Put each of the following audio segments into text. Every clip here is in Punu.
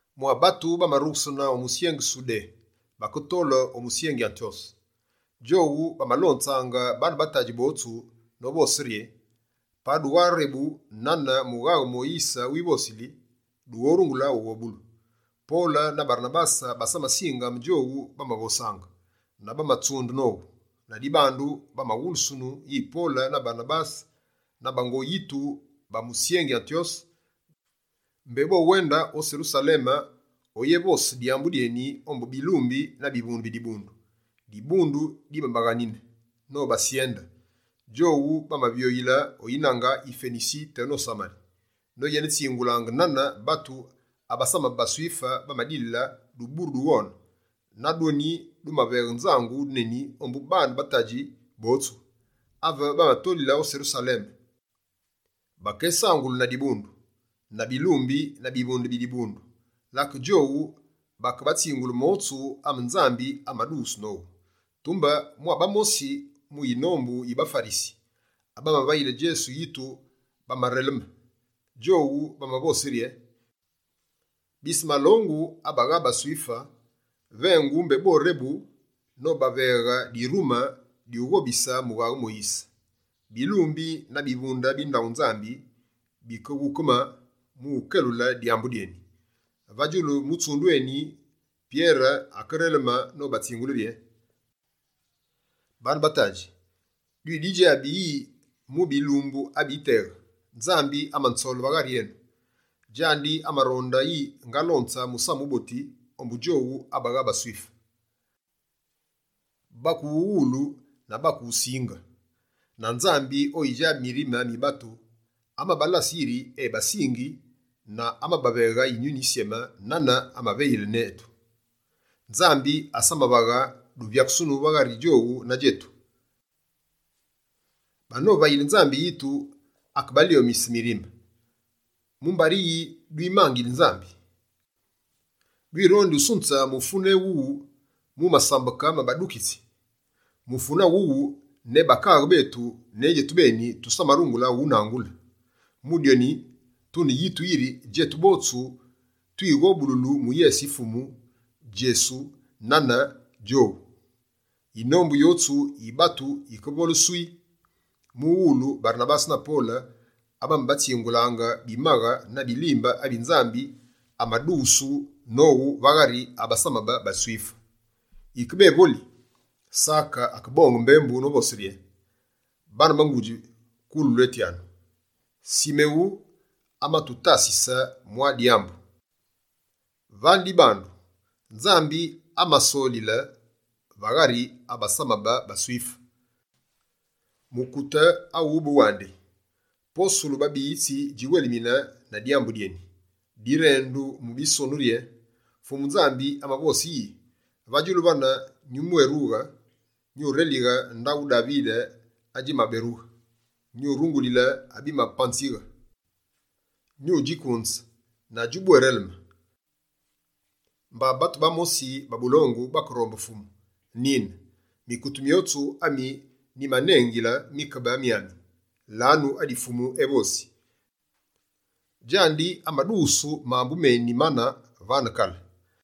Mwa batu bamarughesene o musyengi Sudé, baketole o musyengi Antyose. Djowu bamalonzaange baane ba tadji botsu, novose rye: «Pa dugharebu nane mughaghe Moyise wivosili, dughorungule ughobulu.» Pole na Barenabase basamasinge ame djowu bamavosaange, na bamatsunde nowu. Ladibandu, bamawulusunu yi Pole na Barenabase na bango yitu ba musyengi Antyose, mbé bowende o Serusaleme oyevose dyambu dyeni ombu bilumbi na bivunde bi dibundu. Dibundu dimabaghanine nobasyende. Djowu bamavyoyile o yinange yi Fenisi teno Samari, noyenetsingulaange nane batu abasamabe baSwife, bamadilile duburu du ghone. Na dyoni, dimaveghe nzangu neni ombu baane ba ngudji botsu. Ave bamatolile o Serusaleme, bakesangulu na dibundu, na bilumbi na bivunde bi dibundu. Lake djowu bakebatsingule motsu ame Nzambi amadughusu nowu. Tumbe, mwa bamosi mu yinombu yi baFarisi, abamavayile Djesu yitu bamareleme. Djowu bamavose rye: «Bise malongu abagha baSwife vengu mbé borebu, nobaveghe dirume dyughobise mughaghe Moyise.» Bilumbi na bivunde bi ndaghu Nzambi bikeghukeme mu ukelule dyambu dyeni. Va djulu mutsundu eni wune, Pyere akereleme nobatsingule rye: «Baane ba ngudji, dwididjabi yi mu bilumbu abiteghe, Nzambi amanzole va ghari enu. Djandi amaronde yi ngalonze Musamu Wuboti ombu djowu abagha baSwife, bakewughuwulu na bakewusinge. Na Nzambi, oyidjabi mirime mi batu, amabalase yiri ebasingi, na amabaveghe Yinyuni Yisyeme nane amavayile netu. Nzambi asamavaghe duvyakusunu va ghari djowu na djetu. Bano vayile Nzambi yitu akebalyomise mirime. Mumbari yi dwimangili Nzambi? Dwirondi usunze mufune ewune mu masambeke ma badukitsi? Mufune awuwu, ne bakaaghe betu, ne djetubeni tusamarungule unangule! Mu dyoni, tune yitu yiri djetu botsu twighobululu mu yese yi Fumu Djesu, nane djowandi.» Yinombu yotsu yi batu yikevole «swii», mughulu Barenabase na Pole abamabatsingulaange bimaghe na bilimbe, abi Nzambi amadughusu nowu va ghari abasamabe baSwife. Yike bévoli, Sake akebonge mbembu novose rye: «Baane ba ngudji, kulwetyanu! Simewu amatutasise mwa dyambu: vane dibandu, Nzambi amasolile va ghari abasamabe baSwife, mukute awube wandi. Posulu babiyitsi djiwelmine na dyambu dyeni. Direndulu mu Bisonu rye: “Fumu Nzambi amavose yi: Va djulu vane nyubwérughe. Nyurelighe ndaghu Davide adjimaberughe. Nyurungulile abimapanzighe, nyudjikunze na djubwéreleme, mba batu bamosi ba bulongu bakerombe Fumu. Nine, mikute myotsu ami nyimanengili mikebe myami. Lanu adi Fumu evosi. Djandi amadughusu mambu meni mane, vane kale.”»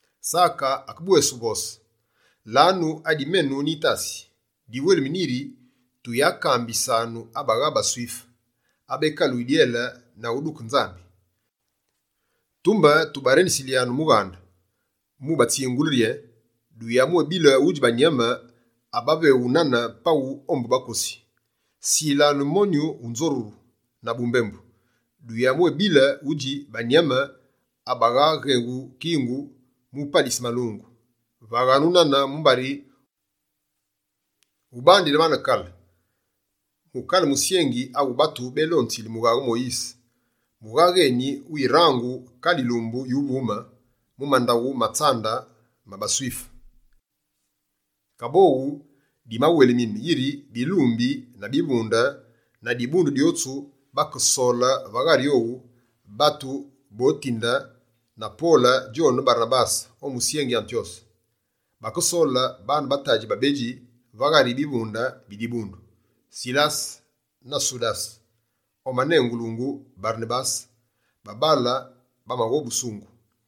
Sake akebwévosi yi: «Lanu adi menu nyitasi: diwelemine yi tuyamwékambise abagha baSwife, abekaluyi dyele na uduke Nzambi. Tumbe tubarendisilyanu mughande, mu ubatsingule rye: “Duyabwebile udji banyame abaveghu nane paghu ombu bakosi. Silanu monyu wu nzoruru na bumbembu, duyabwebile udji banyame abaghaghewu kingu mu upalise malungu.” Vaghanu nane mumbari, ubandile vane kale, mu kale musyengi awu batu bélonzili mughaghe Moyise, mughaghe eni wirangu kale yilumbu yuvume mu mandaghu ma tsambu ma baSwife.» Kaboghu, dimawelmine yiri bilumbi na bivunde, na dibundu dyotsu, bakesole va ghari owu, batu botinde na Pole djone Barenabase o musyengi Antyose. Bakesole baane ba tadji babedji va ghari bivunde bi dibundu: Silase na Sudase omanengulungu Barenabase, babaale bamaghobusungu.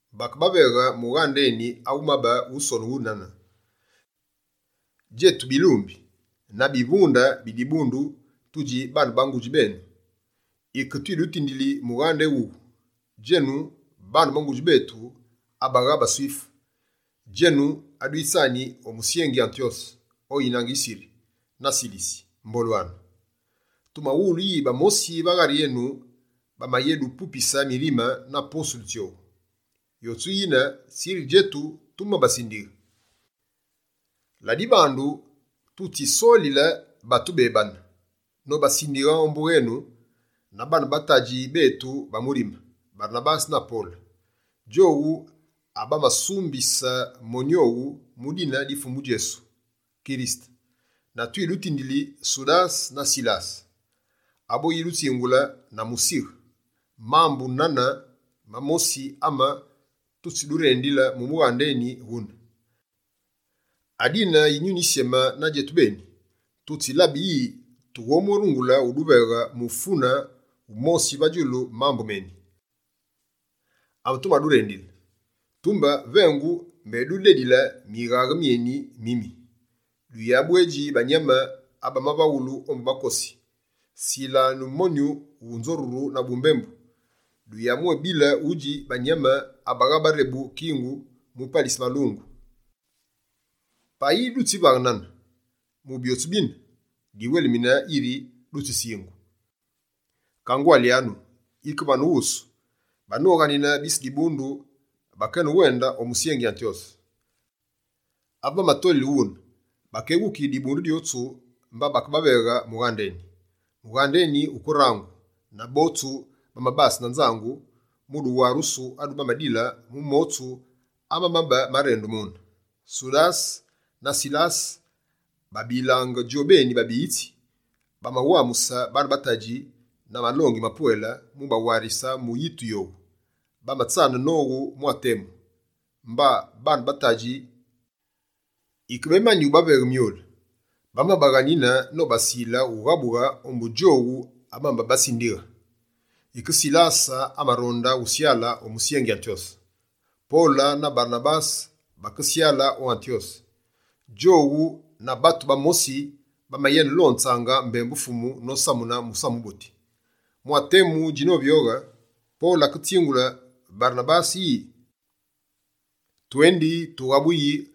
Bakebaveghe mughande eni awumabe wusonughu nane: «Djetu bilumbi na bivunde bi dibundu tudji baane ba ngudji benu. Yike twidutindili mughande éwuwu, djenu baane ngudji betu abagha baSwife, djenu adwitsani o musyengi Antyose o yinange yi Siri na Silisi, mbolwanu! Tumawulu yi bamosi va ghari etu bamayédupupise mirime na posulu tsyowu. Yotsu yine, tsiri djetu tumabasindighe. Ladibandu, tutsisolile batu bébane, nobasindighe ombu wenu na baane ba tadji betu ba murime, Barenabase na Pole. Djowu abamasumbise monyu owu mu dine di Fumu etu Djesu Kirisete. Na twidutindili Sudase na Silase, aboyidutsingule na musighe, mambu mane mamosi ame tutsidurendili mu mughande eni wune. Adine Yinyuni Yisyeme na djetubeni, tutsilabile yi tughobwérungule uduveghe mufune wumosi va djulu mambu meni ametumadurendili. Tumbe vengu, mbé dudedile mighaghe myeni mimi: duyabwedji banyame abavaghulu ombu bakosi, silanu monyu wu nzoruru na bumbembu, duyabwebile udji banyame abaghaghewu kingu mu upalise malungu. Payi dutsivaghe nane mu byotsu bine, diwelimine yiri dutsisungighe. Kangwalyanu, yike vane wusu.» Banoghanine bise dibundu, bakewende o musyengi Antyose. Ave bamatolile wune, bakeghukighe dibundu dyotsu mba bakebaveghe mughande eni. Mughande eni wukerangu, na botsu bamabase na nzangu, mu duwarusu adu bamadile mu motsu amamabe marendu mune. Sudase na Silase, babilange djobeni babiyitsi, bamawamuse baane tadji na malongi mapwele, mu bawarise mu yitu yowu. Bamatsane nowu mwa temu, mba baane ba tadji yikebemani ubaveghe myule, bamabaghanine nobasile ughabughe ombu djowu abamabasindighe.[ Yike, Silase amaronde usyale o musyengi Antyose.] Pole na Barenabase bakesyale o Antyose. Djowu na batu bamosi, bamayenelonzaange mbembu Fumu nosamune Musamu Wuboti. Mwa temu djinovyoghe, Pole aketsingule Barenabase yi: «Twendi tughabuyi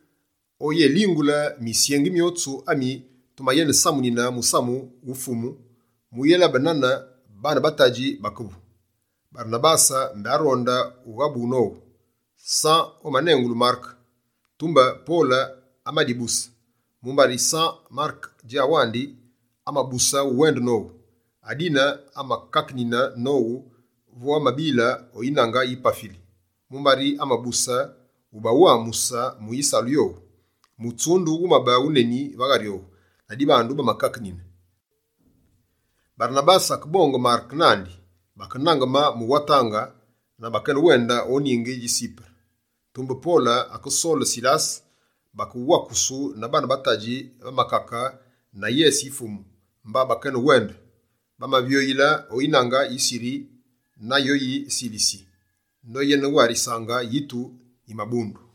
o uyélingule misyengi myotsu ami tumayenesamunine musamu wu Fumu, mu uyélabe nane baane ba tadji bakevu.» Barenabase mbé aronde ubeghe nowu, San omanengulungu Mareke. Tumbe Pole amadibuse, mumbari San Mareke djawandi, amabuse uwende nowu. Adine amakakenine nowu vo bamabile o yinange yi Pafili, mumbari amabuse ubawamuse mu yisalu yowu. Mutsundu wumabe wuneni va ghari owu, la dibandu bamakakenine. Barenabase akebonge Mareke nandi, bakenangeme mu watange na bakeyenewende o ningi dji Sipere. Tumbe Pole akesole Silase, bakewakusu na baane ba tadji va makake na yese yi Fumu, mba bakeyenewende. Bamavyoyile o yinange yi Siri na yo yi Silisi, noyenewarisaange yitu yi mabundu.